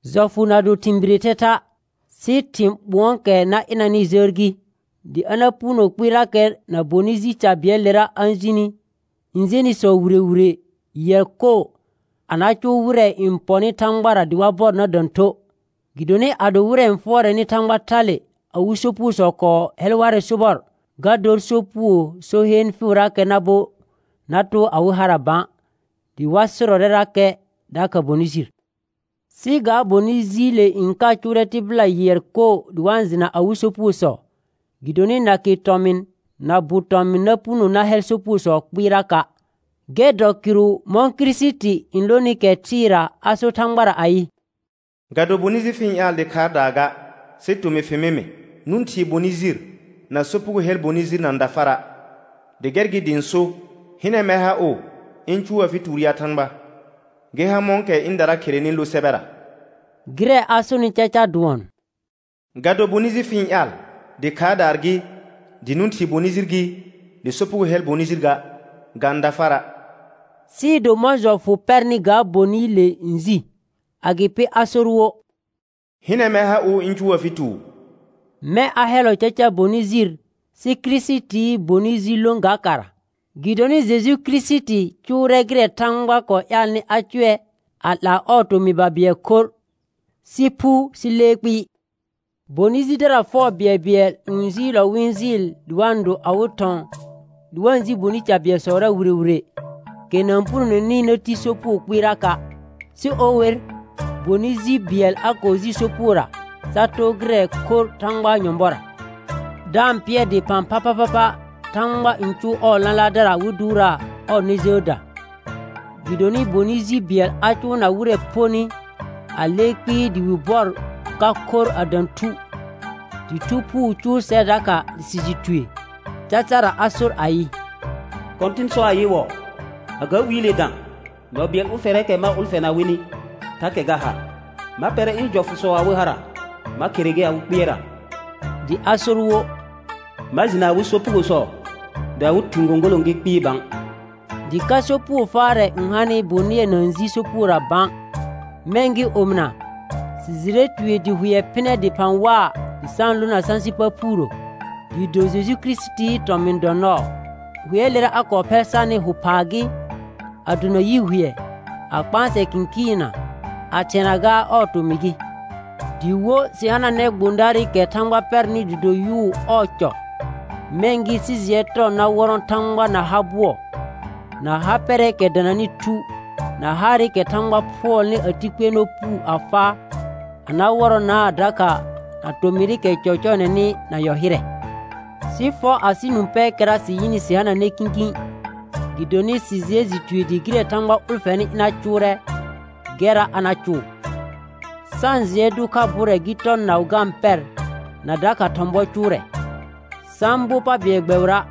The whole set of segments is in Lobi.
Jɔfʋ na do thɩ̃ biree thɛtha', sɩ thɩ̃ ɓʋ̃ɔɔkɛ na ɩnanɩɩ jəər gɩ, dɩ a na puno kpɩɩrakɛ na bonɩ ji ca bɩɛlɩlera n jenɩsɔ wire wire yɩɛr koo, a na cʋʋ wɩrɛ n pɔnɩ Thãgbara dɩ wa bɔr na dã thuə'. Gɩdonɩ ado wɩrɛ n fʋɔrɛnɩ Thãgba thale awɩ sopugosɔ kɔɔ hɛl warɛ sobɔr, ga dor sopugoo so heen fɩɩʋrakɛ na bo na too awɩ hara bã, dɩ wa sɩrɔrɛrakɛ dakha bonɩ jir. Sɩ ga bonɩ jiile n ka cʋʋrɛ tɩbɩla yɩɛr koo dɩ wa-n jɩna awɩ sopugosɔ. Gɩdonɩ nake tɔmɩn na bʋ tɔmɩn na puno na hɛl sopugosɔ kpɩɩraka'. Gɛr dɔ kɩrʋ mɔ̃ Kirisiti n lonɩ kɛ thɩɩra a sor Thãgbara ayɩ: «Ga do bonɩ jir fɩ-n ƴaal dɩ khaardaa ga, sɩ tomɩr fɩ mɩ mɩ. Nʋ̃ thii bonɩ jir, na sopugo hɛl bonɩ jir na-n da fara'; dɩ gɛr gɩ dɩ ɩ̃ so: Hɩnɛ mɛr ha ʋ, ɩ̃ cʋʋ afɩ tuur ya Thãgba, gɩ ha mɔ̃kɛ ɩ̃dara kherenɩ lo sɛbɛra.» Gɩrɛ a sonɩ caca dʋɔn: «Ga do bonɩ jir fɩ-n ƴaal, dɩ khaardaa gɩ, dɩ nʋ̃ thii bonɩ jir gɩ, dɩ sopugo hɛl bonɩ jir ga, ga-n da fara'.» Sɩɩ do mɔ̃ jɔfʋ pɛrnɩ ga bonɩɩle n ji. Agɩpɩ a sor wo: «Hɩnɛ mɛr ha ʋ ɩ̃ cʋʋ afɩ tuur.» Mɛ̃ a hɛllɔ caca bonɩ jir sɩ Kirisitii bonɩ ji lõ ga kara. Gɩdonɩ Jeju Kirisiti cʋʋrɛ gɩrɛ Thãgba kɔɔ ƴaalnɩ a cʋɛ a 'laa ɔɔ tomɩ babɩɛl khorr, sɩ phu sɩ lee kpɩɩ. Bonɩ jidara fɛʋ bɩɛlbɩɛl ƴũ jɩɩlɔ wɩ-n jɩɩl dɩ wa-n do awɩ thɔ̃ dɩ wa-n ji bonɩ ji ca bɩɛlsɔra wire wire, kɛ na-n punoneni na ti sopugo kpɩɩraka'. Sɩ o wer bonɩ ji bɩɛl a kɔɔ ji sopugora sa too gɩrɛ khorr Thãgbaa nyɔ̃bɔra, da-n pɩɛr dɩphã phaphapha Thãgba n cʋʋ ɔɔ lãlaardara wɩ dʋʋraa ɔɔ nɛ jəəda. Gɩdonɩ bonɩ ji bɩɛl a cʋʋna wɩrɛ phonɩ a lee kpɩɩ dɩ wɩ bɔr ka khorr a dã thu. Dɩ Thu Phuu cʋʋ sɛr dakha dɩ sɩ jɩ tue. Cacara a sor ayɩ: «Kɔ̃tɩn sɔ ayɩwɔɔ: A ga wiile dã, nɔ bɩɛl ʋlfɛrɛɛkɛ ma ʋlfɛna wɩnɩ thakɛ ga ha: Ma pɛrɛ ɩ̃ jɔfʋsɔ awɩ hara, ma khere ger awɩ kpɩɛrra.» Dɩ a sor wo: «Ma jɩna awɩ sopugosɔ dɩ awɩ thɩ̃ gõgolõ gɩ kpɩɩ bã.» Dɩ ka sopugo faarɛ n hanɩ bonɩɛ na-n ji sopugora bã. Mɛ̃ gɩ omɩna, sɩ jɩrɛ tue dɩ hʋɛ phɩnɛ dɩphã waa dɩ sa-n lona sãsɩ pa phuurə, dɩɩ do Jeju Kirisitii tɔmɩ̃ dɔ nɔɔ. Hʋɛɛlera a kɔɔ phɛl sarnɩ hʋ phaa gɩ, a dona yi hʋɛ, a kpãsɛ kɩ̃kɩɩnna, a thɩɛna gaa ɔɔ tomɩ gɩ. Dɩ wo sɩ hananɛ gbõdaarɩkɛ Thãgba pɛrnɩ dɩ do yʋʋ ɔɔ cɔ. Mɛ̃ gɩ sɩ jɩɛ tɔ na wɔrɔ̃ Thãgba na ha bʋɔ, na ha pɛrɛɛkɛ dananɩ thu, na haarɩkɛ Thãgba phʋɔlnɩ a ti kpɩɛrnɔ puu a faa, a na wɔrɔnaa dakha na tomɩrɩkɛ cɔcɔɔnɛnɩ na yɔ hɩrɛ. Sɩ fɔ asɩ nũ pɛɛkɛra sɩ yɩnɩ sɩ hananɛ kĩkĩ, gɩdonɩ sɩ jɩɛ jɩ tue dɩ gɩrɛ Thãgba ʋlfɛnɩ ɩna cʋʋrɛ, gɛrra a na cʋʋ. Sa-n jɩɛ dʋ kha bʋrɛ gɩ tɔ naʋ ga-n pɛr na dakha thɔ̃ bɔ cʋʋrɛ. Sa-n bo pa bɩɛl gbɛbɩra',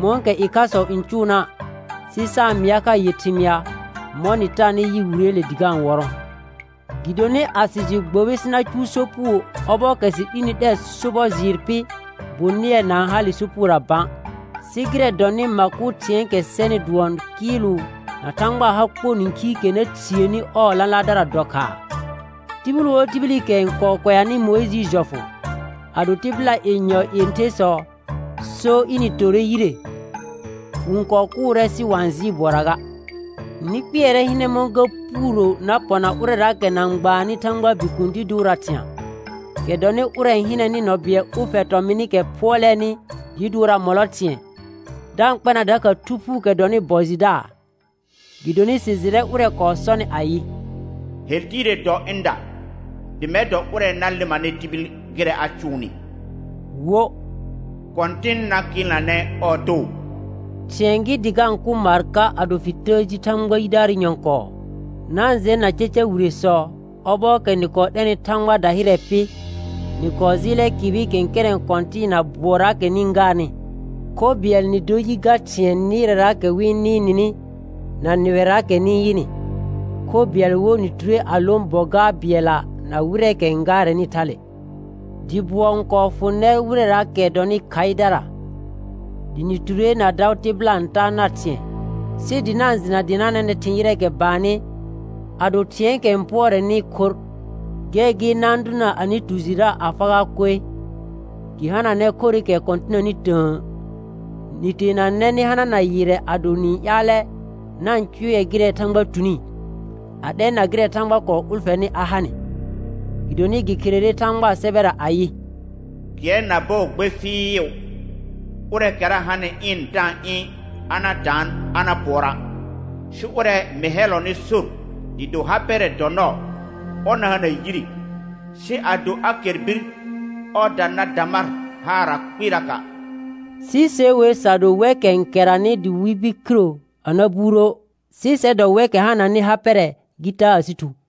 mɔ̃kɛ ɩkhasɔ n cʋʋna', sɩ sa-n mɩa kha yɩr thɩmɩa, mɔ̃ nɩ taanɩ yɩ Wireele dɩ ga-n wɔrɔ̃. Gɩdonɩ a sɩ jɩ gbobi sɩ na cʋʋ sopugo ɔbɔɔkɛ sɩ 'lini 'lɛr sobɔ jɩɩr pɩ, bonɩɛ na-n hale sopugora bã. Sɩ gɩrɛ dɔnɩ ma kʋ thɩ̃ɛɛkɛ sɛnɩ dʋɔn kɩɩlʋ na Thãgbaa ha kpor nĩkhiikɛ na thiəni ɔɔ lãlaardara dɔ khaa. Tibil wo tibilikɛ n kɔɔ kʋɛanɩ Mʋɩjɩɩ jɔfʋ, ado tɩbɩla yenyɔ yẽthersɔ so ɩnɩ torre yire, wɩ-n kɔɔ kʋʋrɛ sɩ wa-n jɩɩ bʋɔra ga. Nɩ kpɩɛrɛ hɩnɛ mɔ̃ ga puuro na pɔna ʋrɛraakɛ na-n gbaannɩ Thãgbaa Bikuun dɩ dʋʋraa thɩ̃a', kɛ dɔnɩ ʋrɛ n hɩnɛnɩ nɔ bɩɛl ʋlfɛ tɔmɩnɩkɛ phʋɔlɛɛnɩ dɩɩ dʋʋraa mɔlɔ thɩ̃ɛ, da-n kpɛna dakha Thu Phuukɛ dɔnɩ bɔ jɩdaa. Gɩdonɩ sɩ jɩrɛ ʋrɛ kɔɔ sɔnɩ ayɩ: «Hel tiire dɔ ɩnda, dɩ mɛr dɔ ʋrɛ na lɩmanɩ tibil gɩrɛ a cʋʋnɩ», wo, «Kɔ̃tɩn na kɩɩlnanɛ ɔɔ too.» Thɩ̃ɛ gɩ dɩ ga-n kʋ maar ka ado fɩ təə ji Thãgba yidaarɩ nyɔ̃kɔɔ. Na-n jɛna caca wiresɔ, ɔbɔɔkɛ nɩ kɔɔ 'lɛnɩ Thãgbaa dahɩrɛ pɩ, nɩ kɔɔ jɩɩlɛ kɩbɩ kɛ̃kɛrɛ̃ kɔ̃tɩɩna bʋɔraakɛ nɩ-n gaarnɩ. Kho bɩɛl nɩ dor yɩ ga thɩ̃ɛ nɩɩrɛraakɛ wɩ-n nɩɩr nɩnɩ na nɩwɛraakɛ nɩ-n yɩnɩ, kho bɩɛl wo nɩ ture a lõ bɔ gaar bɩɛlla na wɩrɛɛkɛ n gaarɛnɩ thale. Dɩ bʋɔ n kɔɔ fʋ nɛr wɩrɛraakɛ dɔnɩ khaɩdara, dɩ nɩ ture na daʋ tɩbɩla n taa nar thɩ̃ɛ, sɩ dɩ na-n jɩna dɩ nɩ hananɛ thɩ̃ ƴɩrɛ baannɩ a do thɩ̃ɛɛkɛ n pʋɔrɛnɩ khorr. Gɛr gɩ na-n dʋna anɩ tu jɩra a fagaa koe, gɩ hananɛ khorɩkɛ kɔ̃tɩnanɩ tə̃ə. Nɩ teenanɛ nɩ hanana yɩrrɛ ado nɩ-n ƴaalɛ na-n cʋɛ gɩrɛ Thãgba tuni, a 'lɛna gɩrɛ Thãgba kɔɔ ʋlfɛnɩ a ha nɩ. Gɩdonɩ gɩ kherere Thãgbaa sɛbɛra ayɩ: «Kɩɛr na bɔɔ gbe fɩɩʋ, ʋrɛɛkɛra hanɩ ɩɩn da-n ɩ̃ a na daan a na pʋɔra'; sɩ ʋrɛ mɩ hɛllɔnɩ sor dɩɩ do ha pɛrɛ dɔ nɔɔ, ɔr na hana yire, sɩ ado a kɛr bir ɔɔda na da mar haara kpɩɩraka'.» Sɩ se wer sa do wɛkɛ n kɛranɩ dɩ wɩ bir khiro a na buurə', sɩ sɛr dɔ wɛkɛ hananɩ ha pɛrɛ gɩ taa asɩ thu.